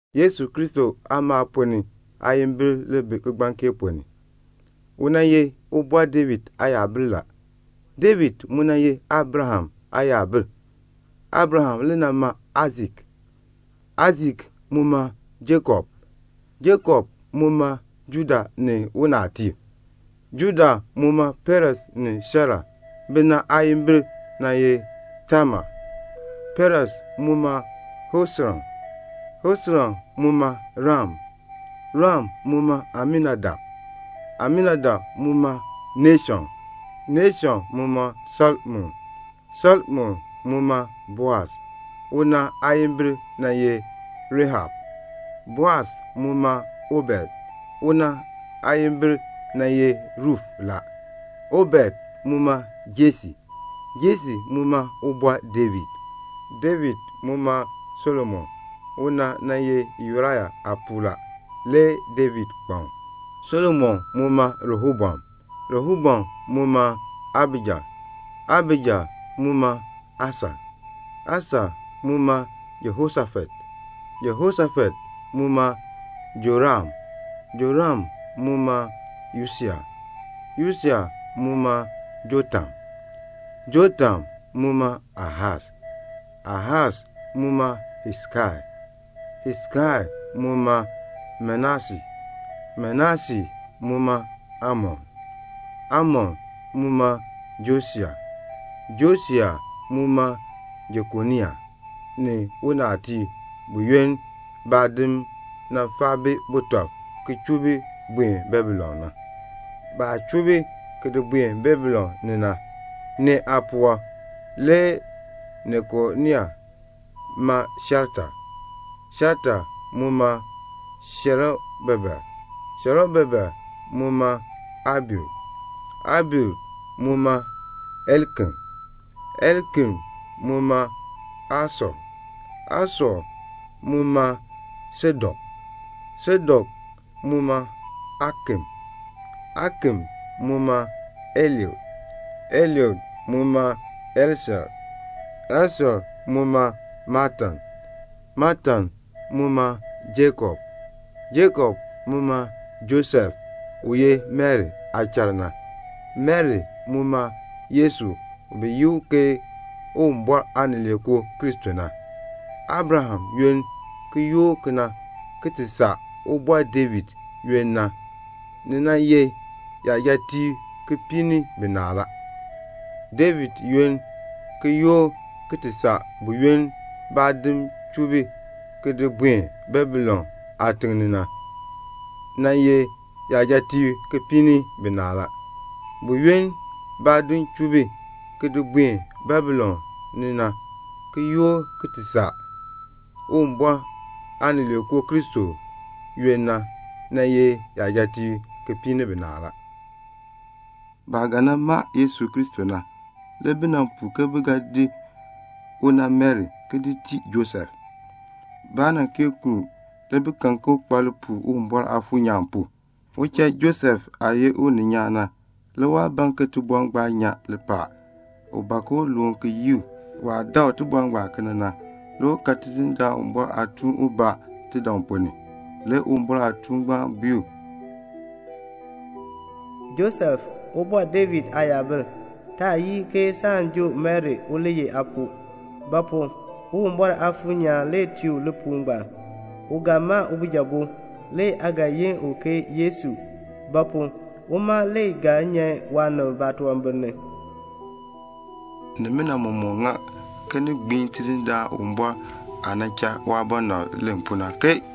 Yesu Kristo aamaal ponn ni le ŋmee kigbaŋ kee ponn ni. U nan ye Ubɔr David aayabil. David mu nan ye Abraham aayabil. Abraham nan ma Aisak, Aisak mu ma Jakob, Jakob mu ma Juda ni unaabitiib. Juda mu ma Peres ni Sera. Bina aayimbil le nan ye Tamar. Peres mu ma Hesron, Hesron mu ma Ram, Ram mu ma Aminadab, Aminadab mu ma Nashon, Nashon mu ma Salmon, Salmon mu ma Boas. Una aayimbil nan ye Rahab la. Boas mu ma Obed. Una aayimbil nan ye Ruf la. Obed mu ma Jese, Jese mu ma Ubɔr David. David mu ma Solomon. Una nan ye Yuraya aapuu la, le David kpan u. Solomon mu ma Rehoboam, Rehoboam mu ma Abija, Abija mu ma Asa, Asa mu ma Jehoshafat, Jehoshafat mu ma Joram, Joram mu ma Usia, Usia mu ma Jotam, Jotam mu ma Ahas, Ahas mu ma Hesekia, Hesekia mu ma Manase, Manase mu ma Amon, Amon mu ma Josia, Josia mu ma Jekonia ni unaabitiib buyoonn baadim nan faa bi butɔb ki chuu bi buen Babilon na. Baah chuu bi ki di buen Babilon ni na, nee aapuwɔb le Jekonia ma Shealtiel, Shealtiel mu ma Serubabel, Serubabel mu ma Abiud, Abiud mu ma Eliakim, Eliakim mu ma Asor, Asor mu ma Sadok, Sadok mu ma Akim, Akim mu ma Eliud, Eliud mu ma Eleasar, Eleasar mu ma Matan, Matan mu ma Jakob, Jakob mu ma Josef, u ye Mari aachal na. Mari mu ma Yesu u bi yi u ke Uwumbɔr Aanileekoo Kristo na. Abraham aamaal ponn ni ki yoor kena ki ti saa Ubɔr David aamaal na, ni nan ye yajatiib kipiik ni binaa. David aamaal ponn ni ki yoor ki ti saa buyoonn baadim chuu bi ki di buen Babilon aatiŋ ni na, nan ye yajatiib kipiik ni binaa. Buyoonn baadim chuu bi ki di buen Babilon ni na ki yoor ki ti saa Uwumbɔr Aanileekoo Kristo na, nan ye yajatiib kipiik ni binaa. Baah ga nan ma Yesu Kristo na, le bi nan puu ke bi ga di una Mari ki di tii Josef. Baa kee kuln u, le bi kan ke u kpa lipuul Uwumbɔr Aafuur nyaan pu. Uchal Josef aah ye uninyaan na, le waa ban ke tibɔr ngbaan nyan lipaal. U ban ke u loon ki yii u. Waah dakl tibɔr ngbaan kena na, le u kan Tidindaan Uwumbɔr aatuun ubaa tidaŋ ponn ni. Le Uwumbɔr aatuun ngbaan bui u, "Josef, Ubɔr David aayabil, taa yii ke saan joo Mari u li ye aapuu; ba pu? Uwumbɔr Aafuur nyaan le tii u lipuul ngbaan. U ga ma ubijabo, le aa ga yi u Yesu; ba pu? uma le ga nyan waanib baatunwambir ni." Nimina mɔmɔk nan ŋa ke ni gbiin Tidindaan Uwumbɔr aah nan cha waabɔnabr len pu na, ke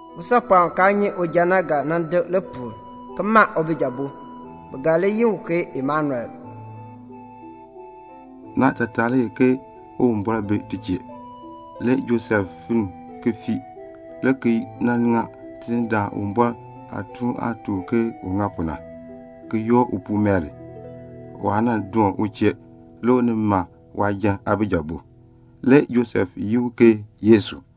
"Usaapɔɔn u kaa nyi uja na ga nan dek lipuul ki ma ubijabo, bi ga li yi u ke Immanuel." (Naatataa le ye ke "Uwumbɔr bi ti chee".) Le Josef finn ki fii le ki nan ŋa Tidindaan Uwumbɔr aatuun aah tuk u ke un ŋa pu na, le ki yoor upuu Mari. Waa doon u chee le u nin ma waajan aabijabo. Le Josef yin u ke Yesu.